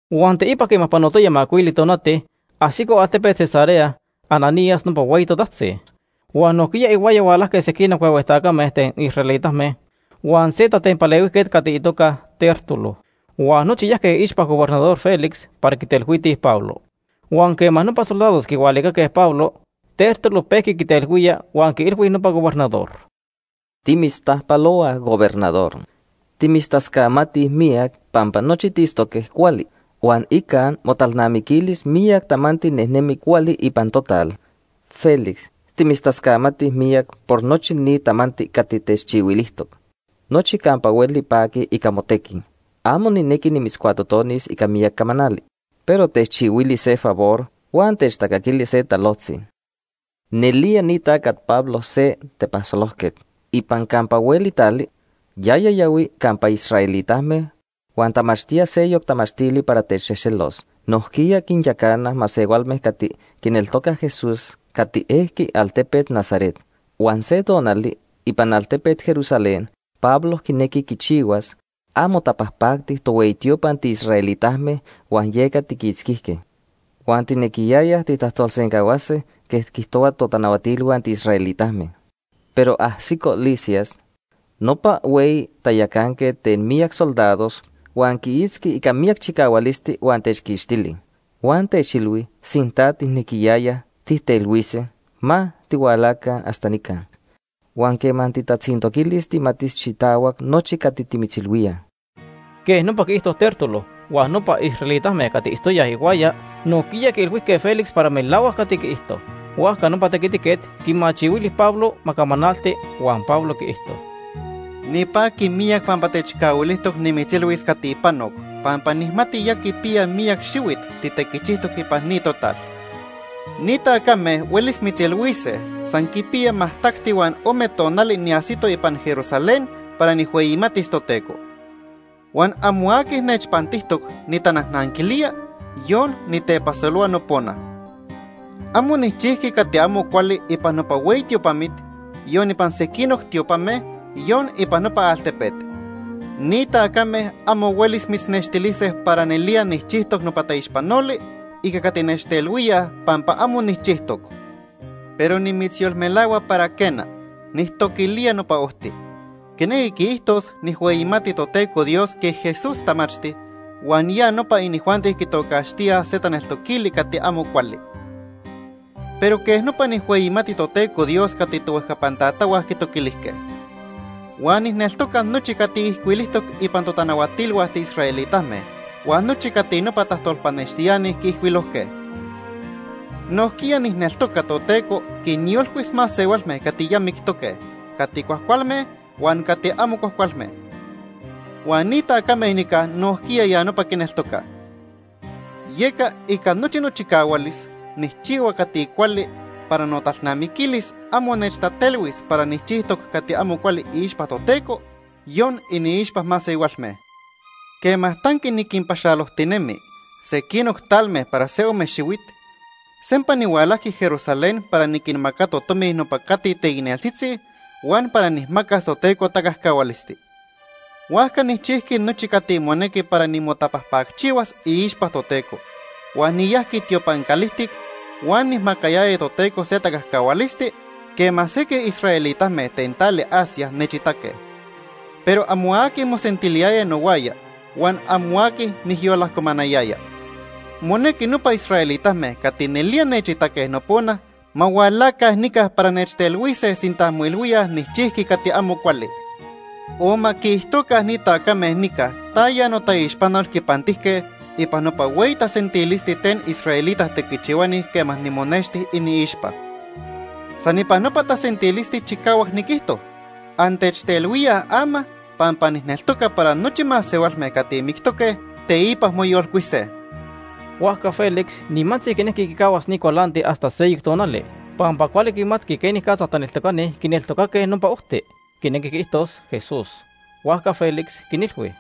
Huan teipa quema panotoya macuili tonati, ajsico altepet Cesarea Ananías nopa hueyi totajtzi. Huan nojquiya ihuaya hualajque sequinoc huehue tacame ten israelitame huan se tatempalehuijquet cati itoca Tértulo. Huan nochi yajque iixpa Gobernador Félix para quitelhuitij Pablo. Huan quema nopa soldados quihualicaque Pablo, Tértulo pejqui quitelhuía huan quiilhui nopa gobernador: ―Timitztajpalohuaj, Gobernador. Timitztascamatij miyac pampa nochi tiitztoque cuali, huan ica motalnamiquilis miyac tamanti nejnemi cuali ipan total. Félix, timitztascamatij miyac por nochi ni tamanti cati techchihuilijtoc. Nochi campa hueli paquij ica motequi. Amo nijnequi nimitzcuatotonis ica miyac camanali, pero techchihuili se favor huan techtacaquili se talojtzi. “Nelía ni tacat Pablo se tepasolojquet. Ipan campa hueli tali, yaya yahui campa israelitame huan tamachtía seyoc tamachtili para techxejxelos. Nojquiya quinyacana masehualme cati quineltocaj Jesús cati ejqui altepet Nazaret. Huan se tonali ipan altepet Jerusalén Pablo quinejqui quichihuas amo tapajpacti tohueyi tiopa tiisraelitame huan yeca tiquitzquijque. Huan tijnequiyayaj tijtajtolsencahuasquíaj quej quiijtohuaj totanahuatilhua tiisraelitame, pero ajsico Lisias, nopa hueyi tayacanquet ten miyac soldados huan quiitzqui ica miyac chicahualisti huan techquixtili. Huan techilhui sinta tijnequiyayaj tijtelhuise, ma tihualaca hasta nica. Huan quema tijtatzintoquilis tijmatis xitahuac nochi cati timitzilhuíaj.” Quej nopa quiijto Tértulo, huan nopa israelitame cati itztoyaj ihuaya nojquiya quiilhuijque Félix para melahuac cati quiijto. Huajca nopa tequitiquet quimachihuili Pablo ma camanalti huan Pablo quiijto: ―Nipaqui miyac pampa techcahuilijtoc nimitzilhuis cati panoc pampa nijmati ya quipiya miyac xihuit titequichijtoc ipan ni total. Ni tacame huelis mitzilhuise san quipiya majtacti huan ome tonali niajsito ipan Jerusalén para nijhueyimatis Toteco. Huan amo aqui nechpantijtoc nitanajnanquilía, yon nitepasolohua nopona. Amo nijchijqui cati amo cuali ipan nopa hueyi tiopamit, yon ipan sequinoc tiopame, yon ipan nopa altepet. Ni tacame amo huelis mitznextilise para nelía nijchijtoc nopa taixpanoli ica cati nechtelhuíaj pampa amo nijchijtoc. Pero nimitzyolmelahua para quena, nijtoquilía Nopa Ojti. Quinequi quiijtos nijhueyimati Toteco Dios quej Jesús tamachti, huan ya nopa inijuanti quitocaxtía se taneltoquili cati amo cuali. Pero quej nopa nijhueyimati Toteco Dios cati tohuejcapan tatahua quitoquilijque. Huan nijneltoca nochi cati ijcuilijtoc ipan totanahuatilhua tiisraelitame huan nochi cati nopa tajtolpanextiani quiijcuilojque. Nojquiya nijneltoca Toteco quinyolcuis masehualme cati ya mictoque, cati cuajcualme huan cati amo cuajcualme. Huan ni tacame nica nojquiya ya nopa quineltocaj. Yeca ica nochi nochicahualis nijchihua cati cuali para notalnamiquilis amo nechtatelhuis para nijchijtoc cati amo cuali iixpa Toteco, yon iniixpa masehualme. “Quema tanqui niquinpaxalojtinemi sequinoc talme para se ome xihuit, sempa nihualajqui Jerusalén para niquinmacato tomi nopa cati teicneltzitzi huan para nijmacas Toteco tacajcahualisti. Huajca nijchijqui nochi cati monequi para nimotapajpacchihuas iixpa Toteco, huan niyajqui tiopan calijtic huan nijmacayaya Toteco se tacajcahualisti quema sequij israelitame ten tali Asia nechitaque. Pero amo aqui mosentiliyaya nohuaya huan amo aqui nijyolajcomanayaya. Monequi nopa israelitame cati nelía nechitaque nopona ma hualaca nica para nechtelhuise sinta moilhuíaj nijchijqui cati amo cuali. O ma quiijtoca ni tacame nica taya notaixpanol quipantijque ipan nopa hueyi tasentilisti ten israelita tequichihuani quema nimonexti iniixpa. San ipan nopa tasentilisti chicahuac niquijto: ‘Antechtelhuíaj ama pampa nijneltoca para nochi masehualme cati mictoque, teipa moyolcuise.’” Huajca Félix nimantzi quinejqui quicahuas ni cualanti hasta seyoc tonali pampa cuali quimatqui quenicatza taneltocani quineltocaque Nopa Ojti, quinequi quiijtos Jesús. Huajca Félix quinilhui: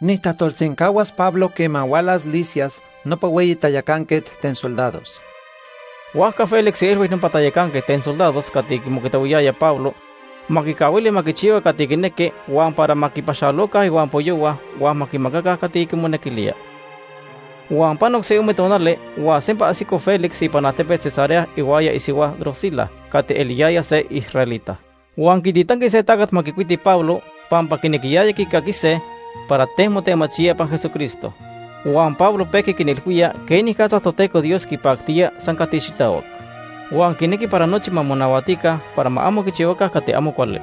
―Nijtajtolsencahuas Pablo quema hualas Lisias nopa hueyi tayacanquet ten soldados. Huajca Félix quiilhui nopa tayacanquet ten soldados cati quimocuitahuiyaya Pablo ma quicahuili ma quichihua cati quinequi huan para ma quipaxaloca ihuampoyohua huan ma quimacaca cati quimonequilía. Huan panoc se ome tonali huan sempa ajsico Félix ipan altepet Cesarea ihuaya isihua Drusila cati eliyaya se israelita. Huan quititanqui se tacat ma quicuiti Pablo pampa quinequiyayaj quicaquise para ten motemachía ipan Jesucristo. Huan Pablo pejqui quinilhuía quenicatza Toteco Dios quipactía san cati xitahuac. Huan quinequi para nochi ma monahuatica para ma amo quichihuaca cati amo cuali.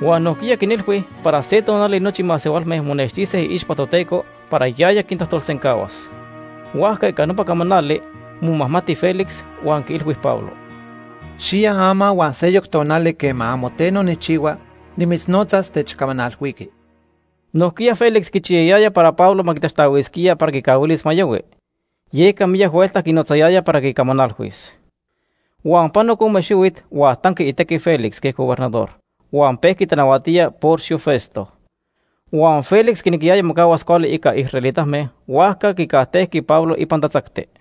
Huan nojquiya quinilhui para se tonali nochi masehualme monextise iixpa Toteco para yaya quintajtolsencahuas. Huajca ica nopa camanali momajmati Félix huan quiilhui Pablo: ―Xiya ama huan seyoc tonali quema amo teno nijchihua, nimitznotzas techcamanalhuiqui. Nojquiya Félix quichiyayaya para Pablo ma quitaxtahuisquía para quicahuilis ma yahui, yeca miyac huelta quinotzayaya para quicamanalhuis. Huan panoc ome xihuit, huan tanqui itequi Félix quej gobernador huan pejqui tanahuatía Porcio Festo. Huan Félix quinequiyaya mocahuas cuali ica israelitame, huajca quicajtejqui Pablo ipan tatzacti.